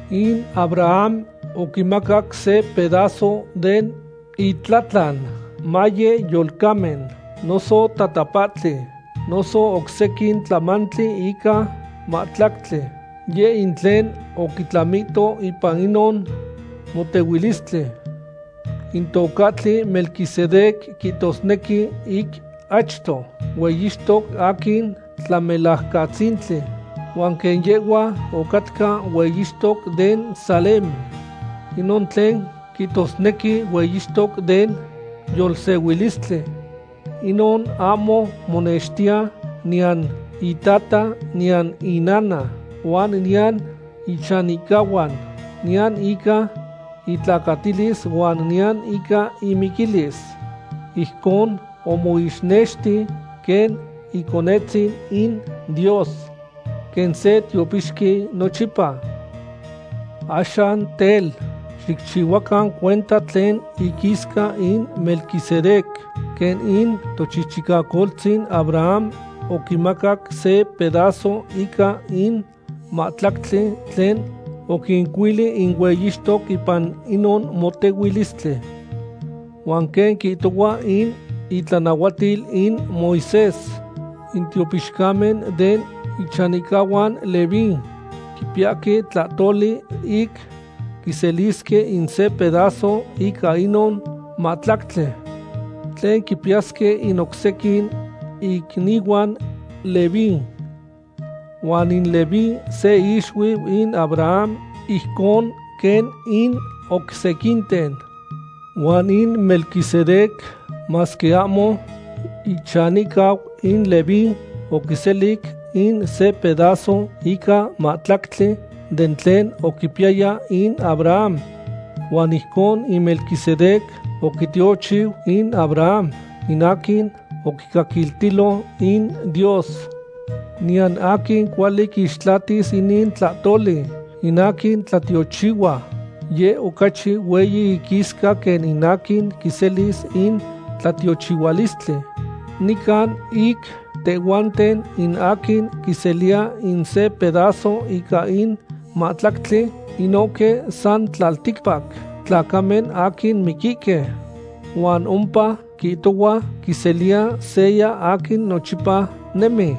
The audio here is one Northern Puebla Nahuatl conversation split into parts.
In Abraham oquimacac se pedazo den itlatlan, maye yolcamen, noso tatapahtli, noso oc sequin tlamantli ica mahtlactli, yeh in tlen oquitlamito ipan inon motehuilistli. In tocahtli Melquisedec quihtosnequi ic achto, “hueyixtoc aquin tlamelajcatzintli”, huan quen yehhua ocatca hueyixtoc den Salem, inon tlen quihtosnequi “hueyixtoc den yolsehuilistli.” Inon ahmo monextiya niyan itata niyan inana huan niyan ichanihcahuan, niyan ica itlacatilis huan niyan ica imiquilis. Ijcon omoixnexti quen Iconetzin in Dios, quen se tiopixqui nochipa. Axan tel, xicchihuacan cuenta tlen iquisca in Melquisedec, quen in tochichicacoltzin Abraham oquimacac se pedazo ica in mahtlactli tlen oquincuili in hueyixtoque ipan inon motehuilistli. Huan quen quihtohua in itlanahuatil in Moisés, in tiopixcamen den ichanihcahuan Leví quipiyahque tlahtoli ic quiselisque in se pedazo ica inon mahtlactli tlen quipiyasque in oc sequin icnihuan Leví. Huan in Leví se ixuiu in Abraham ijcon quen in oc sequinten. Huan in Melquisedec, masque ahmo ichanihcau in Leví, oquiselic in se pedazo ica mahtlactli den tlen oquipiyaya in Abraham. Huan ijcon in Melquisedec oquitiochiu in Abraham, in aquin oquicaquiltilo in Dios. Niyan aquin cuali quixtlatis inin tlahtoli. In aquin tlatiochihua, yeh ocachi hueyi iquisca quen in aquin quiselis in tlatiochihualistli. Nican ic tehhuanten, in aquin quiseliya in se pedazo ica in mahtlactli, inohque san tlalticpac tlacamen aquin miquihque. Huan ompa quihtohua quiseliya seya aquin nochipa nemi.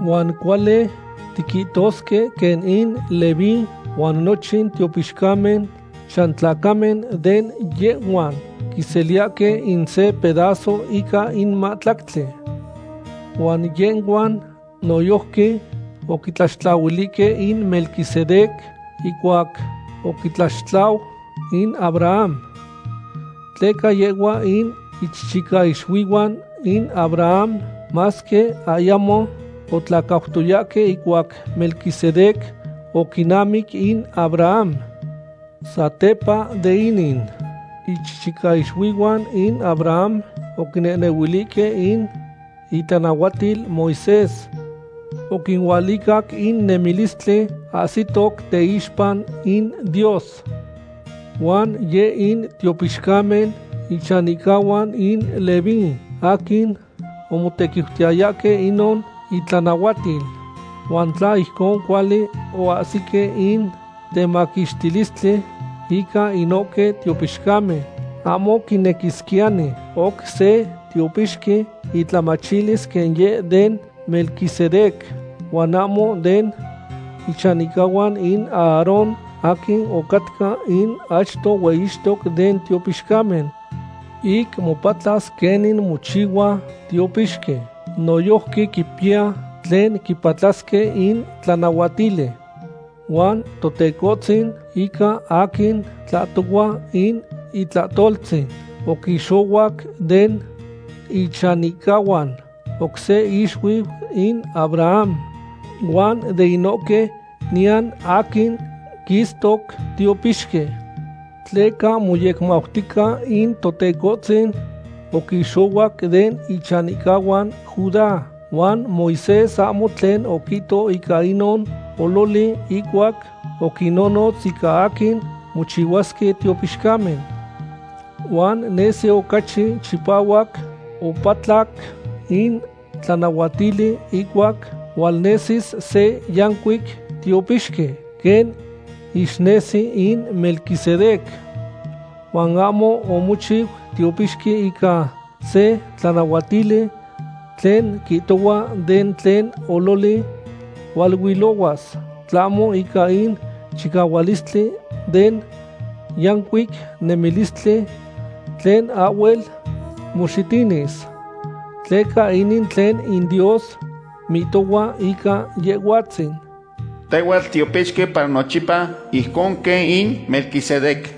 Huan cuali tiquihtosque quen in Leví huan nochin tiopixcamen chantlacamen de yehhua quiseliyahque in se pedazo ica in mahtlactli. Huan yehhuan noyojqui oquitlaxtlahuilihque in Melquisedec ihcuac oquitlaxtlau in Abraham. Tleca yehhuan in ichichicaixuihuan in Abraham, masque ayamo otlacautoyahque ihcuac Melquisedec oquinamic in Abraham. Satepa de inin, ichichicaixuihuan in Abraham oquinehnehuilihque in itlanahuatil Moisés oquinualicac in nemilistli ahsihtoc teixpa in Dios. Huan yeh in tiopixcamen ichanihcahuan in Leví aquin omotequiutiyayahque inon itlanahuatil. Huan tla ijcon cuali ahsisque in temaquixtilistli ica inohque tiopixcamen, ahmo quinequisquiyani oc se tiopixqui itlamachilis quen yeh den Melquisedec, huan ahmo den ichanihcahuan in Aarón aquin ocatca in achto hueyixtoc den tiopixcamen. Ic mopatlas quenin mochihua tiopixqui, noyojqui quipiya tlen quipatlasque in tlanahuatili. Huan Totecohtzin, ica aquin tlahtohua in itlahtoltzin, oquixohuac den ichanihcahuan oc se ixuiu in Abraham, huan de inohque niyan aquin quistoc tiopixqui. Tleca moyecmautica in Totecohtzin oquixohuac den ichanihcahuan Judá, huan Moisés ahmo tlen oquihto ica inon ololi ihcuac oquinnonotz ica aquin mochihuasque tiopixcamen. Huan nesi ocachi chipahuac opatlac in tlanahuatili, ihcuac hualnesis se yancuic tiopixqui quen ixnesi in Melquisedec. Huan ahmo omochiu tiopixqui ica se tlanahuatili tlen quihtohua de tlen ololi hualuilohuas, tlahmo ica in chicahualistli den yancuic nemilistli tlen ahhuel moxitinis. Tleca inin tlen in Dios mihtohua ica Yehhuatzin: Tehhuatl titiopixqui para nochipa, ijcon quen in Melquisedec.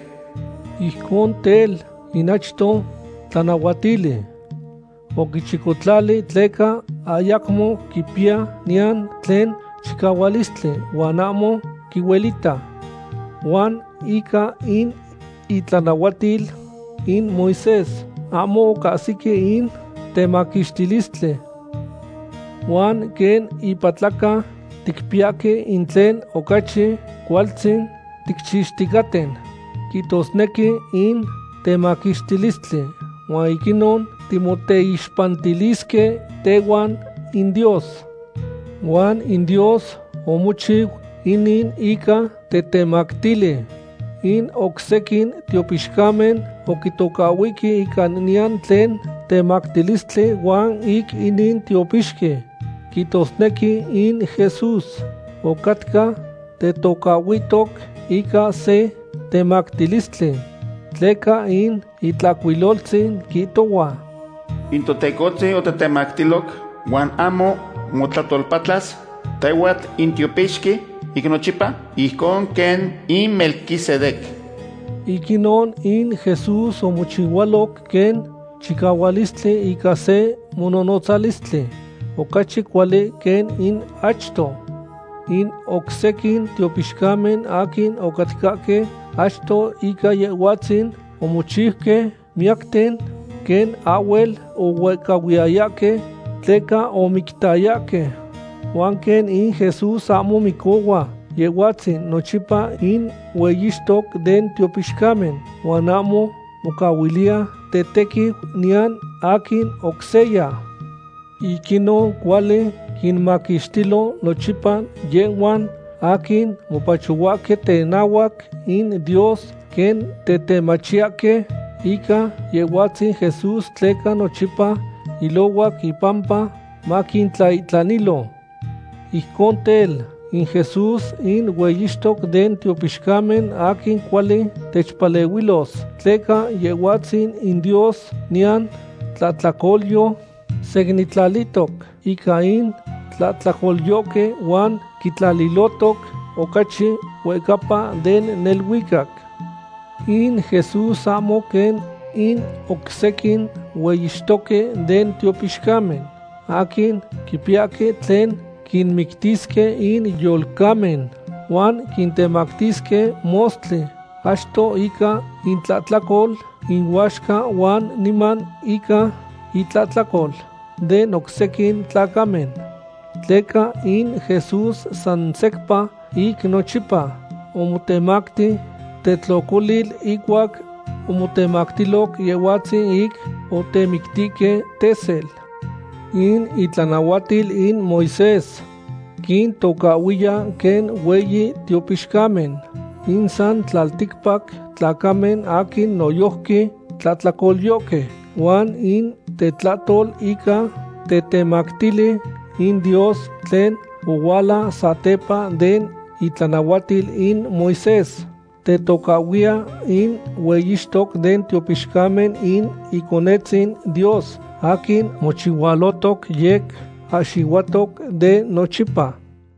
Ijcon tel, in achto tlanahuatili oquichicotlali tleca ayacmo quipiya niyan tlen chicahualistli huan ahmo quihuelita. Huan ica in itlanahuatil in Moisés ahmo ocahsique in temaquixtilistli. Huan quen ipatlaca ticpiyahque in tlen ocachi cualtzin ticchixticaten, quihtosnequi in temaquixtilistli, huan ic inon timoteixpantilisque tehuan in Dios. Huan in Dios omochiu inin ica tetemactili. In oc sequin tiopixcamen oquintocahhuihque ica niyan tlen temactilistli huan ic inin tiopixqui, quihtosnequi in Jesús, ocatca tetocahhuihtoc ica se temactilistli, tleca in Itlahcuiloltzin quihtohua: In Totecohtzin otetemactiloc, huan ahmo motlahtolpatlas: “Tehhuatl in tiopixqui ic nochipa, ijcon quen in Melquisedec.” Ic inon in Jesús omochihualoc quen chicahualistli ica se mononotzalistli ocachi cuali quen in achto. In oc sequin tiopixcamen aquin ocatcahque achto ica Yehhuatzin omochiuque miyacten, quen ahhuel ohuehcahuiyayahque tleca omictayahque. Huan quen in Jesús ahmo micohua, Yehhuatzin nochipa in hueyixtoc den tiopixcamen, huan ahmo mocahuiliya tetequiu niyan aquin oc seya. Ic inon cuali quinmaquixtilo nochipa yehhuan aquin mopachohuahque tenahuac in Dios quen tetemachiyahque ica Yehhuatzin Jesús tleca nochipa ilohuac impampa maquintlaihtlanilo. Ijcon tel, in Jesús in hueyixtoc den tiopixcamen aquin cuali techpalehuilos, tleca Yehhuatzin in Dios, niyan tlahtlacolyo, secnintlalihtoc ica in tlahtlacolyohque huan quitlalilohtoc ocachi huehcapa den neluicac. In Jesús ahmo quen in oc sequin hueyixtoque den tiopixcamen, aquin quipiyahque tlen quinmictisque in yolcamen huan quintemactisque mostli, achto ica intlahtlacol inuaxca huan niman ica intlahtlacol den oc sequin tlacamen. Tleca in Jesús san secpa ic nochipa omotemacti tetlocolil ihcuac omotemactiloc Yehhuatzin ic otemictihque tesel. In itlanahuatil in Moisés quintocahhuiya quen hueyi tiopixcamen in san tlalticpac tlacamen aquin noyojqui tlahtlacolyohque. Huan in tetlahtol ica tetemactili in Dios tlen ohuala satepa den itlanahuatil in Moisés tetocahhuiya in hueyixtoc den tiopixcamen in Iconetzin Dios aquin mochihualotoc yec ahxihuatoc de nochipa.